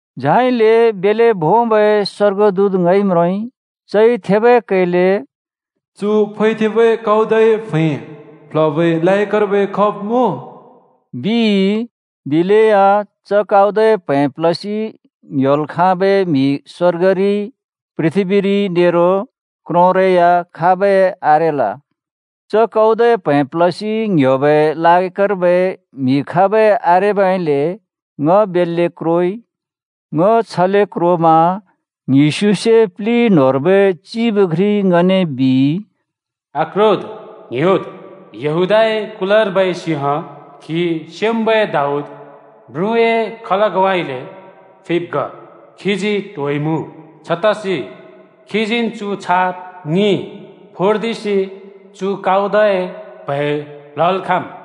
झाइले बेल्‍ले भोंबै स्‍वर्गदूत ङइ म्रोंइ। चइ थेबै कैले, “चु फैथेंबै काउदए प्हैं प्‍ल्हबै लायकर्बै खाब् मुँ?” बिइ। दिलेया च काउदए प्हैं प्‍ल्हसि ङ्ह्‍योल् खाँबै म्‍हि स्‍वर्गरि, पृथ्‍बीरि नेरो क्रोंरै या खाबै आरेल। च काउदए प्हैं प्‍ल्हसि ङ्ह्‍योबै लायकर्बै म्‍हि खाबै आरेबइले ङ बेल्‍ले क्रोइ। ङ छले क्रोमा ङ्हिस्युसे प्लि न्‍होंर्बै चिब घ्रिइ ङने बिइ, “आक्रोद्, ङ्ह्‍योद्! यहूदाए कुलर्बै सिंह, खी स्‍योंम्‍बै दाऊद म्रुँए खलगउँइँले फिब् ग। खीजी ट्होइमुँ। छतसि खीजीन् चु छाप ङि फोर्दिसि चु काउदए प्हैं प्ल्हल् खाँम्।”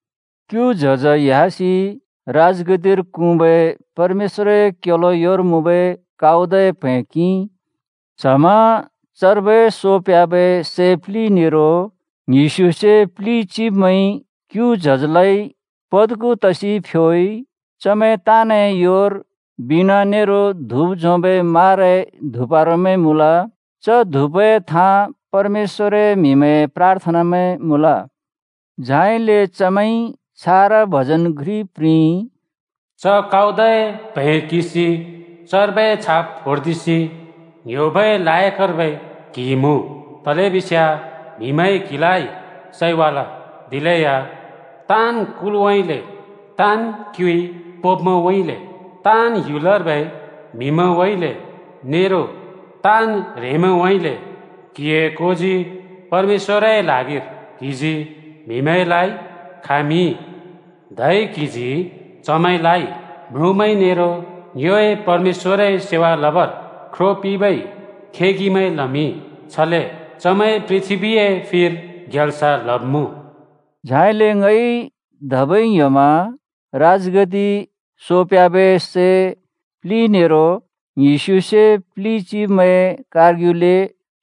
क्‍यु च्हज ह्‍यासि राजगद्दिर क्हुँबै परमेश्‍वरए क्‍योलो योर मुँबै काउदए प्हैं किंइ। च्हमा चर्बै सो प्ह्‍याबै सै प्लि नेरो ङ्हिस्युसे प्लि चिब्मैंइ क्‍यु च्हजलाइ पद्खु तसि फ्‍योइ। चमैं ताँनए योर बीणा नेरो धुप झोंबै माराए धुपारामैं मुँल। च धुपए थाँ परमेश्‍वरए म्‍हिमैंए प्राथनमैं मुँल। झाइले चमैंइ छारा भजन घ्रि प्रिंइ: “च काउदए प्हैं किंसि चर्बै छाप फोर्दिसि ङ्‍ह्‍योबै लायकर्बै क्‍हि मुँ। तलेबिस्याँ म्‍हिमैंइ क्हिलाइ सैवाल, दिलेया ताँन् कुलउँइँले, ताँन् क्युइ पोंब्‍मैंउँइँले, ताँन् ह्‍युलर्बै म्हिमैंउँइँले नेरो ताँन् ह्रेंमैंउँइँले, क्‍हिए कोजी परमेश्‍वरए ल्हागिर क्हिजी म्हिमैंलाइ खामिंइ। धै क्‍हिजी चमैंलाइ म्रुँमैं नेरो ङ्योए परमेश्‍वरए सेवा लबर ख्रो पिंबै खेगिमैं लमिंइ। छले चमैंइ पृथ्‍बीए फिर ग्याल्स लब्मुँ।” झाइले ङइ धबै ङ्ह्‍योमा राजगद्दि, सो प्ह्‍याबै सै प्लि नेरो ङ्हिस्युसे प्लि चिब्मैंए कारग्युले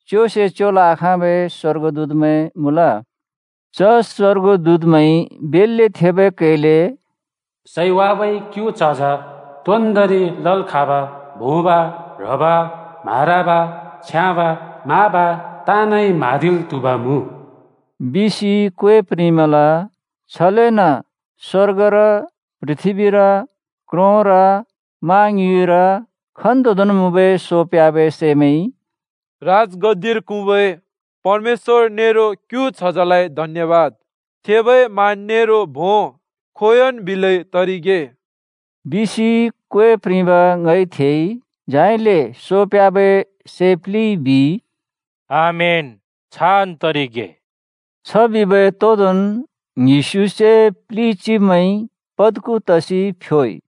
च्योसे च्योल् आखाँबै स्‍वर्गदूतमैं मुँल। च स्वर्गदूतमैंइ बेल्‍ले थेबै कैले “सैवाबै क्‍यु च्हज तोन्दोंरि लल् खाँब, भोंब, ह्रब, म्हारब, छ्याँब, माब, ताँनइ म्हाँदिल् त्हुब मुँ!” बिसि क्वे प्रिंमल। छलेन स्‍वर्गर, पृथ्‍बीर, क्रोंर, मा ङ्युँइर, खन्तोंदोंन् मुँबै सो प्ह्‍याबै सैमैंइ “राजगद्दिर क्हुँबै परमेश्‍वर नेरो क्‍यु च्हजलाइ धन्‍यबाद, थेबै मान नेरो भों खोंयोंन् बिलै तरिगे।” बिसि क्वे प्रिंब ङइ थेइ। झाइले सो प्ह्‍याबै सै प्लिइ बिइ, “आमेन, छान् तरिगे!” छबिबै तोदोंन् ङ्हिस्युसे प्लि चिब्मैंइ पद्खु तसि फ्‍योइ।